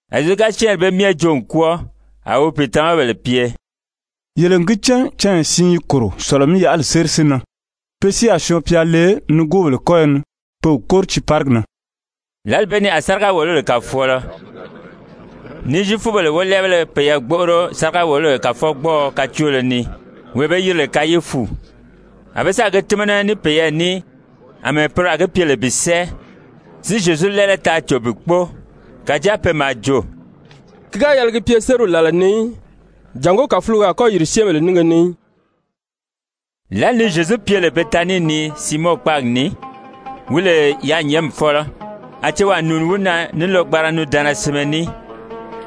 A Zyezu ga syɛ́ɛnri bee myɛ joo n kwɔ́ɔ, a wi wi pìitamabèle pye: «Yele n gi cán canya siin yi kòro, Sɔ̀lɔ-mí-yaʔali séri si nan. Pe si a Syɔɔn-pya le wi nigoobèle kɔ́yɔ ni pe wi kóri tiiparigi na.» Lǎli bee ni a sáriga-wòlobèle kàfɔɔlɔZyefubèle wólɛɛbéle peyɛɛ gbóʔoro sáriga-wòlobèle kàfɔgbɔɔɔ kacoolo ni, wee be yiri lè Kayifu. A be sáà gi tímana ní peyɛɛ ní àmɛɛ poro a gi pye lè bi sɛ́ɛ, si Zyezu lɛ́ɛlɛ taa cò bi kpóo. Kàjáa pe maa jo: «Ki ga yɛlɛ gi pye sériw làla ni í, jàngó kàfulogo a kɔ́ yìri syɛ́ɛnbèle nínge ni í.» Lǎli ni Zyezu pye lè Betanii ni Siimɔn kpáagi ni, wi lè yaanyɛɛnmi fɔ́lɔ, a cewaa nùuni wi na ní lɔgbanra nundaanna sinmɛ ní,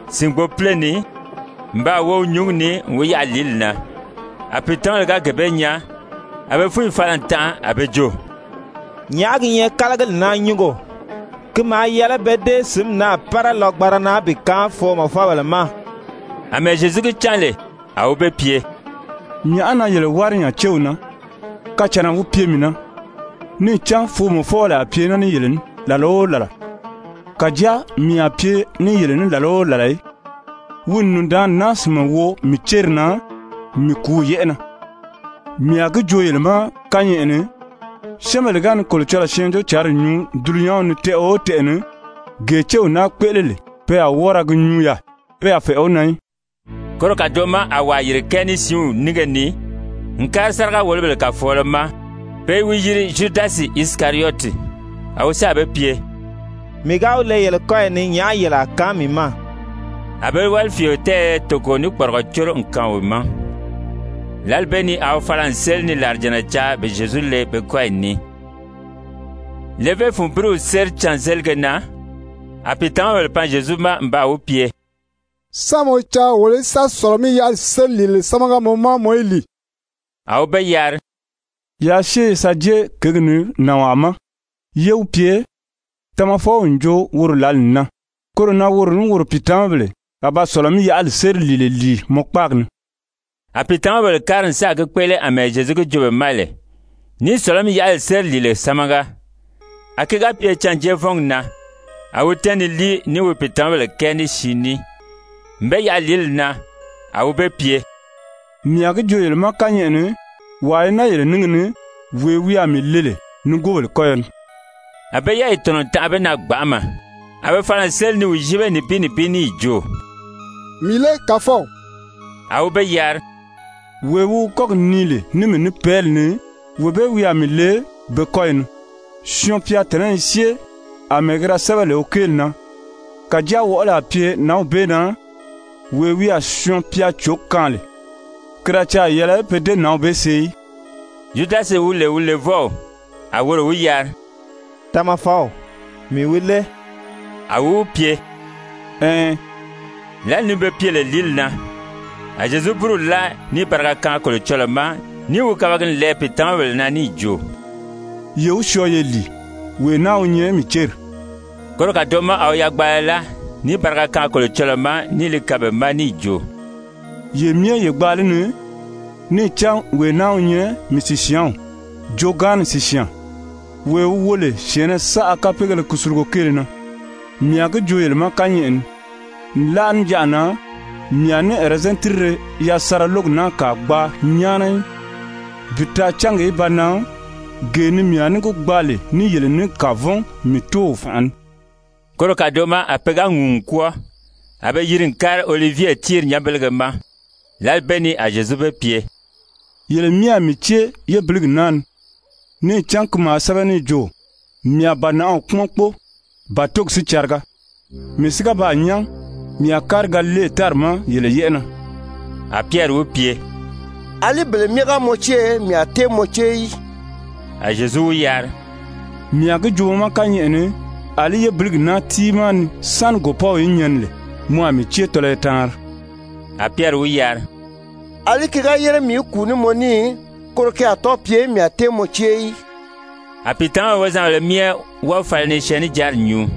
sìngbopile ni, n baa wo wi nyúngi ni n wi yaʔa lìíli na. A pìitamabèle ga gee bee nyaa, a be fúnyi fala n tanʔa a be jo: «Nyàʔá gi nyɛ kálagili naa nyúngo? Ki maa yɛlɛ pe dée sǐnmi naa pára lɔgbanra na bi kaan foomɔfɔbèle ma.» Amɛɛ Zyezu gi cán lè, a wi be pye: «Nyàʔá na yele wári nya céw na? Kacànna wi pye mii na. Níì cán foomɔfɔbèle a pye naa ní yele ní làla o làla, kàjáa mii a pye ní yele ní làla o làla í. Wi n nùndaanni naa sìnmɛ wo mii céri na mii kùúw yɛ́ʔɛ na. Mii a gi joo yele ma kányɛʔɛ ni, syɛ́ɛnbèle ga ni Kolocɔlɔɔ Syɛɛnjóocǎnri nyuu dulunyanw ni tɛʔɛ o tɛʔɛ ni, gee céw naa kpéʔele lè, pe a wɔ́ɔ ra gi nyuu yaà, pe a fɛ̀ʔɛ wi na í.» Koro kàdoʔo ma a wàa yìri kɛɛ ní siinw nínge ni n kári sáriga-wòlobèle kàfɔɔlɔ ma, pe i wi yiri Zyudasi Isikariyɔti. A wi sáà be pye: «Mii ga wi le yele kɔ́yi ni, nyàʔá yele a kaan mii ma?» A be wálifiio tɛɛyɛ toko ní kpɔrigɔ córo n kaan wi ma. Lǎli bee ni a wi fala n séli ni làrijànna caa bi Zyezu le be kɔ́yi ni. Levé fun búruw séri cânzelige na, a pìitamabèle pan Zyezu ma n baa wi pye: «Sán mɔ caa wolo í sa Sɔ̀lɔ-mí-yaʔali séri lìile sámaga mɔ ma, mɔ í lìi?» A wi be yari: «Yaa syée ye sa jée kěgi ni nànwaa ma, yé wi pye, Tamafɔw n jo woro lǎli n nan, koro na woro ní woro pìitamabèle a ba Sɔ̀lɔ-mí-yaʔali séri lìile lìi mɔ kpáagi ni.» A pìitamabèle kári n sáà gi kpéʔele àmɛɛ Zyezu gi joo be ma lè, níì Sɔ̀lɔ-mí-yaʔali séri lìile sámaga. A ki ga pye cânjeevɔngi na, a wi tɛ́ɛn ni líi ní wi pìitamabèle kɛɛ ní siin ní. N be yaʔa lìíli na, a wi be pye: «Mii a gi joo yele ma kányɛʔɛ ni, wàa i naa yele níngi ni, wee wi a mii le lè nigoobèle kɔ́yɔ ni.» A be yɛ́ɛyi tɔ̀nɔ n tanʔa be na gbanʔama. A be fala n séli ni wi yíbe nibin nibin níì jo: «Mii lé, Kàfɔw A wi be yari: «Wee wi wi kɔ́gi nii lè ní mii ní pɛ́ɛli ni, wee bee wi a mii le be kɔ́yi ni. Syɔɔn-pya tɔ̀nɔ́ i syée àmɛɛ ki da sɛ́bɛ lè wi kéeli na. Kàjáa wɔʔɔli a pye nǎnw bee na, wee wi a Syɔɔn-pya cǒ kaan lè! Ki da caà yɛlɛ pe dée nǎnw bee see í.» Zyudasi wi lè wi levɔw, a woro wi yari: «Tamafɔw, mii wi lé?» A wi wi pye: «Ɛɛn.» Lǎli ni be pye lè lìíli na, a Zyezu búruw láa níì bariga kaan Kolocɔlɔɔ ma níì wi kabagi n lɛɛ pìitamabèle na níì jo: «Ye wi syɔɔ ye lìi. Wee naa wi nyɛ mii céri.» Koro kàdoʔo ma a wi yagbaala láa níì bariga kaan Kolocɔlɔɔ ma níì li kaan be ma níì jo: «Ye myɛ ye gbaa li ni. Níì cán wee naa wi nyɛ mii sìsyaanw, joogaanni sìsyaan, wee wi wo lè syɛ̀ɛnnɛ saʔa kapeegéle kusulugo kéele na. Mii a gi joo yele ma kányɛʔɛ ni, nlaʔa níjanʔa na mii a ní ɛrɛzɛn tírire yasanra lógi naa kàa gbaa nyáana í, bi taa cángi í ba nan gee ni mii a ní gi gbaa lè ní yele ní kavɔn mii Tóow fànʔa ni.» Koro kàdoʔo ma a pe ga ŋùu n kwɔ́ɔ, a be yiri n kári Olivye tíiri nyanbelege ma. Lǎli bee ni a Zyezu be pye: «Yele myɛ a mii cée yébiligi naa ni. Níì cán ki maa sɛ́bɛ níì jo: ‹Mii a bànaʔaw kpúmɔn kpóo, bàtogi si cariga.› Mii si ga baa nyán, mii a kári Galile tári ma yele yɛ́ʔɛ na.» A Pyɛri wi pye: «Alí bele myɛ ga mɔ cée, mii a tée mɔ cée í.» A Zyezu wi yari: «Mii a gi joo mɔ ma kányɛʔɛ ni, àlí yébiligi naa tiimaa ni sáni gòpɔ́w í nyɛni lè, mɔ a mii cée tɔlɔyɔ taanri.» A Pyɛri wi yari: «Alí ki ga yére mii í kùu ní mɔ ní, koro ki a tɔ́ɔ pye, mii a tée mɔ cée í.» A pìitamabèle wozanbèlē myɛ wɔ́ɔ̀ fala ni syɛɛnnijanri nyuu.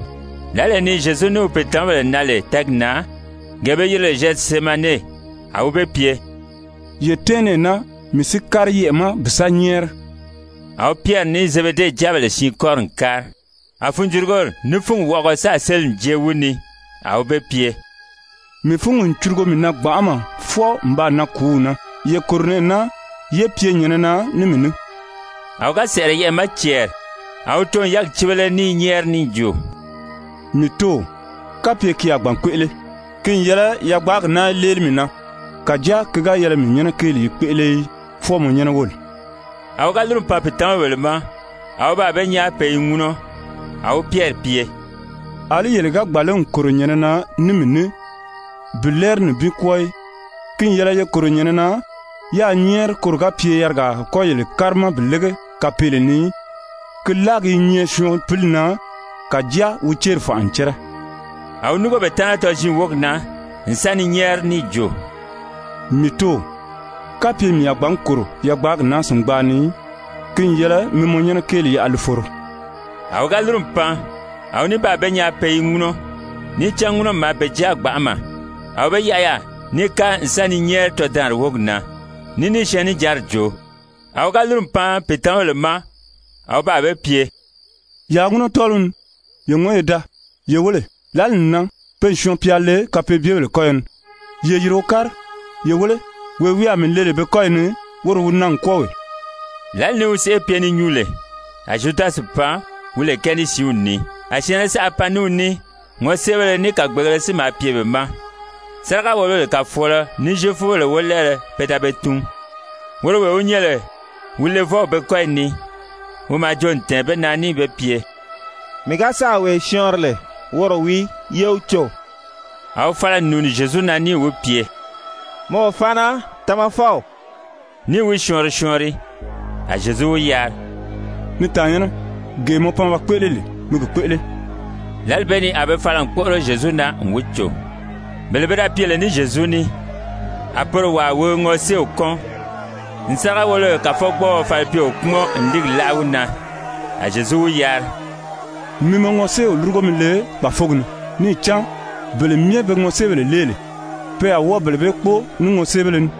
Lǎlee ni Zyezu ní wi pìitamabèle nan lè tɛ́ɛgi na, gee be yiri lè Zyɛtisemane, a wi be pye: «Ye tɛ́ɛn nɛɛ naa, mii si kári yɛʔɛ̀ ma bi sa nyɛ́ɛri.» A wi Pyɛri ní Zebede jáabèle siin kɔ́ri n kári. A funjurugori ní fúngi wɔʔɔgɔ sáà séli n jée wi ni. A wi be pye: «Mii fúngi n curugo mii na gbanʔama, fwɔɔ n baa nan kùúw na, ye kòro nɛɛ naa, yé pye nyɛ̀nɛ na ní mii ní.» A wi ga sɛ̀ʔɛrɛ yɛʔɛ̀ ma cɛɛri, a wi too n wi yɛ́ɛgi cíbele ní i nyɛ́ɛri níì jo: «Mii Tóow, kapye ki a gbǎn kpéʔele, ki n yɛlɛ yagbaagi naa í léeli mii na! Kàjáa ki ga yɛlɛ mii nyɛ́nɛ kéeli í kpéʔele í, fwɔɔ mɔ nyɛ́nɛ wóli.» A wi ga lúru n pan pìitamabèle ma, a wi baa be nyaa pe i ŋúnɔ. A wi Pyɛri pye: «Alí yele ga gbàn lé n kòro nyɛ̀nɛ na ní mii ní bi lɛ́ɛri nibin kwɔ́ɔ í? Ki n yɛlɛ ye kòro nyɛ̀nɛ na yáā nyɛ́ɛri koro ga pye yarigaa a kɔ́ yele kárima bi lége kapeele ni í. Ki láagi i nyɛ syɔɔn pili na, kàjáa wi céri fànʔa n cɛ́rɛ.» A wi núngo be taana tɔziin wógi na, n sa ni nyɛ́ɛri níì jo: «Mii Tóow, kapye mii a gbǎn kòro yagbaagi naa sìngbaa ni í, ki n yɛlɛ mi mɔ nyɛ́nɛ kéeli yaʔa li foro.» A wi ga lúru n pan, a wi ní baa be nyaa pe i ŋúnɔ, níì cán ŋúnɔmi maa be jáa gbanʔama. A wi be yaʔa yaà níì kári n sa ni nyɛ́ɛri tɔdaanri wógi na, ní níì syɛɛnnijanri joo. A wi ga lúru n pan pìitamabèle ma a wi baa be pye: «Yaa ŋúnɔ tɔ́ɔliw ni, ye ŋɔ́n ye daa! Ye wéle, lǎli n nan, pe n Syɔɔn-pya le kapeebyebèle kɔ́yɔ ni. Ye yìri wo kári. Ye wéle, wee wi a mii le lè be kɔ́yi ni, woro wi nan n kwɔ́ɔ wee.» Lǎli ni wi sèʔê pye ni nyuu lè, a Zyudasi pan, wi lè kɛɛ ní siinw ni. A syɛ̀ɛnnɛ saʔa pan ní wi ní ŋɔséebéle ní kàgbeegēle si maa pye be ma, sáriga-wòlobèle kàfɔɔlɔZyefubèle wólɛɛbéle pe da be tun. Woro wee wi nyɛ lè wi levɔw be kɔ́yi ni, wi maa joo n tɛ̀ɛn be na níì be pye: «Mii ga sáà wee syɔɔnri lè, woro wii, ye wi cò.» A wi fala n nùuni Zyezu na níì wi pye: «Mɔ o faana, Tamafɔw.» Níì wi syɔɔnri syɔɔnri. A Zyezu wi yari: «Ni tàannyɛnnɛ, gee mɔ pan ba kpéʔele lè, mi gi kpéʔele.» Lǎli bee ni a be fala n kpóʔoro Zyezu na n wi cò. Bele be da pye lè ní Zyezu ní, a poro wàa wi ŋɔséew kɔ́n n sáriga-wòlobèle kàfɔgbɔɔɔ falipyeo kpúmɔn n líigi láʔa wi na. A Zyezu wi yari: «Mi mɔ ŋɔséew lúrugo mi le kpàfogi ni. Níì cán bele myɛ be ŋɔséebèle lée lè, pe a wɔ́ɔ bele bee kpóo ní ŋɔséebéle ní.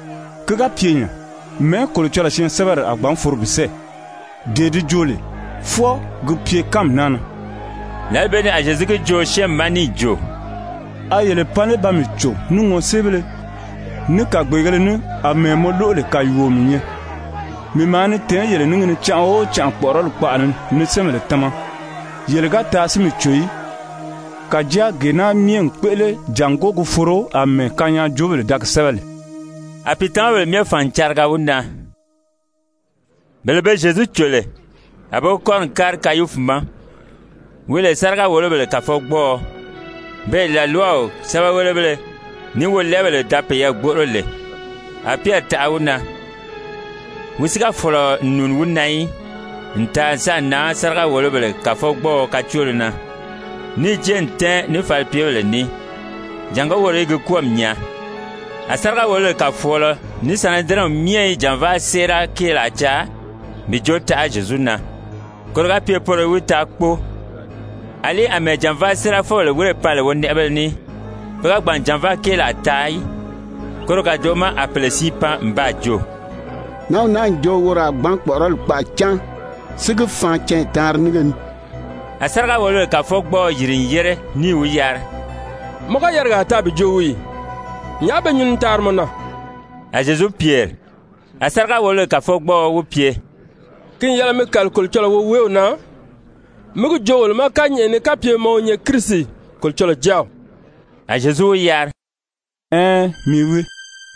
Ki ga pye nya, mɛ̀ɛ́ Kolocɔlɔɔ syɛɛnsɛbɛri a gbǎn foro bi sɛ́ɛ, dee di joo lè, fwɔɔ gi pye kánmi naa na?» Lǎli bee ni a Zyezu gi joo syɛ́ɛnmi ma níì jo: «A yele pan lé ba mii cò ní ŋɔséebéle, ní kàgbeegēle ní àmɛɛ mɔ lóʔo lè kàyuuo mii nyɛ? Mii maa ni tɛ̀ɛ́n yele níngi ni canʔa o canʔa kpɔ̀ʔɔrɔli kpaʔa ni ni syɛ́ɛnbèle tama, yele ga taa si mii cò í. Kàjáa gee naa myɛ n kpéʔele jàngó gi foro àmɛɛ kanyaajoobèle da gi sɛ́bɛ lè.» A pìitamabèle myɛ fàn n cariga wi na. Bele be Zyezu cò lè, a be wi kɔ́ri n kári Kayifu ma, wi lè sáriga-wòlobèle kàfɔgbɔɔɔ, beè làlwaw sɛ́bɛwelebéle ní wolɛɛbèle da peyɛɛ gbóʔoro lè. A Pyɛri taʔa wi na, wi si ga fɔ̀lɔ n nùuni wi na í, n taa n sáà nan sáriga-wòlobèle kàfɔgbɔɔɔ kacoolo na, níì jée n tɛ́ɛn ní falipyebèle ní, jàngó woro í gi kwɔ́ɔmi nyaa. A sáriga-wòlobèle kàfɔɔlɔ ní Sanedirɛnw myɛ i jànvaa séera kéelaa caa bi jo taʔa Zyezu na, koro ga pye poro í wi taa kpóo. Alí àmɛɛ jànvaa séerafɔbèle wírè pan lè wonɛʔɛbéle ní, pe ga gbàn n jànvaa kéelaa taa í. Koro kàdoʔo ma a pèle siin pan n baa jo: «Nǎnw naa n jo woro a gbǎn kpɔ̀ʔɔrɔli kpaʔa cáan, si gi faan canya taanri nínge ni.» A sáriga-wòlobèle kàfɔgbɔɔɔ yìri n yére níì wi yari: «Mɔ ga yarigaa taa bi joo wii ì? Nyàʔá be nyuu ni taari mɔ na?» A Zyezu pyèri. A sáriga-wòlobèle kàfɔgbɔɔɔ wi pye: «Ki n yɛlɛ mi kàli Kolocɔlɔɔ woweew na, mí gi joo wolo ma kányɛʔɛ ni kapye mɔ wi nyɛ Kirisi, Kolocɔlɔɔ Jáaw.» A Zyezu wi yari: «Ɛɛn, mii wii.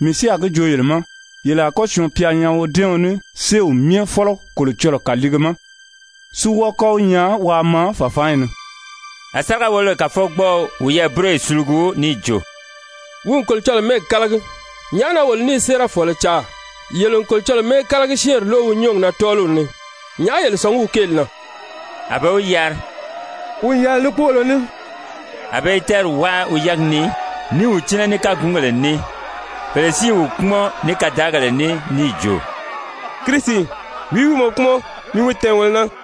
Mii si a gi joo yele ma, yele a kɔ́ Syɔɔn-pya nyaa wodɛ́ɛɔn ní séew myɛ fɔ́lɔ Kolocɔlɔɔ kàliige ma, si wɔ́ɔ kɔ́ wi nyaa waa maa fàfaanyi ni.» A sáriga-wòlobèle kàfɔgbɔɔɔ wiyɛɛ búroyi sulugu níì jo: «Wi n Kolocɔlɔɔ mɛ́ɛgi kálagi. Nyàʔá na wolo ní i séerafɔɔlɔ caa? Yele n Kolocɔlɔɔ mɛ́ɛkalagi-syɛ́ɛnri lóʔo wi nyɔ́ɔgi na tɔ́ɔliw ni. Nyàʔá yele sɔ̀ngí wi kéeli na?» A be wi yari: «Wi n yɛlɛ ní kpóolo ní.» A be i tɛ́ɛri wáa wi yɛ́ɛgi ni ní i wi cínɛ ní kágungèle ní, pèle si i wi kpúmɔn ní kadaagèle ní níì jo: «Kirisi, wìí wi mɔ kpúmɔn? Mi wi tɛ̀ɛn wolo na.»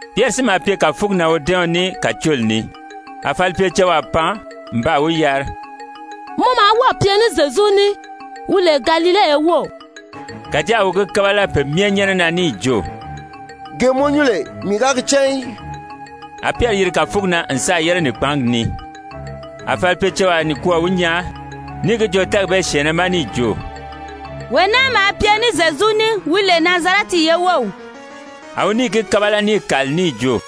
Pyɛri si maa pye kàfugi na wodɛ́ɛɔn ní kàcooli ni. A falipyecewaa pan n baa wi yari: «Mɔ maa wɔ́ɔ̀ pye ní Zyezu ní, wi lè Galile ye wów.» Kàjáa a wi gi kábala pe myɛ nyɛ́nɛ na níì jo: «Gee mɔ nyuu lè, mii ga gi cán í.» A Pyɛri yiri kàfugi na n sáà yére nìkpaangi ni. A falipyecewaa nikwɔɔ wi nyaa níì gi joo tɛ́ɛgi bee syɛ̀ɛnnɛ ma níì jo: «Wee naa maa pye ní Zyezu ní, wi lè Nazarɛti ye wów.» A wi níì gi kábala níì kàli níì jo: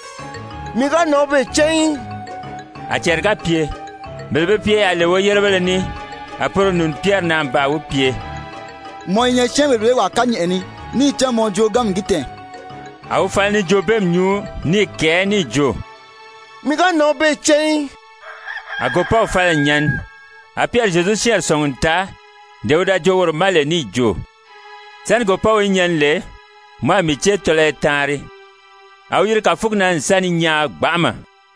«Mii ga nǎnw bee cán í.» A cɛɛri ga pye, bele be pye yaà lè woyérebéle ní, a poro nùuni Pyɛri na n baa wi pye: «Mɔ i nyɛ syɛ́ɛnbèle bee wàa kányɛʔɛ ni, níì cán mɔ jooganmi n gi tɛ̀ɛn.» A wi fala ni joobeemi nyuu ní i kɛ̀ɛ́ níì jo: «Mii ga nǎnw bee cán í.» A gòpɔ́w fala n nyɛni. A Pyɛri Zyezu syɛ́ɛnri sɔ̀ngi n taa dee wi da joo woro ma lè níì jo: «Sáni gòpɔ́w í nyɛni lè, mɔ a mii cée tɔlɔyɔ taanri.» A wi yiri kàfugi na n sa ni nyaan gbanʔama.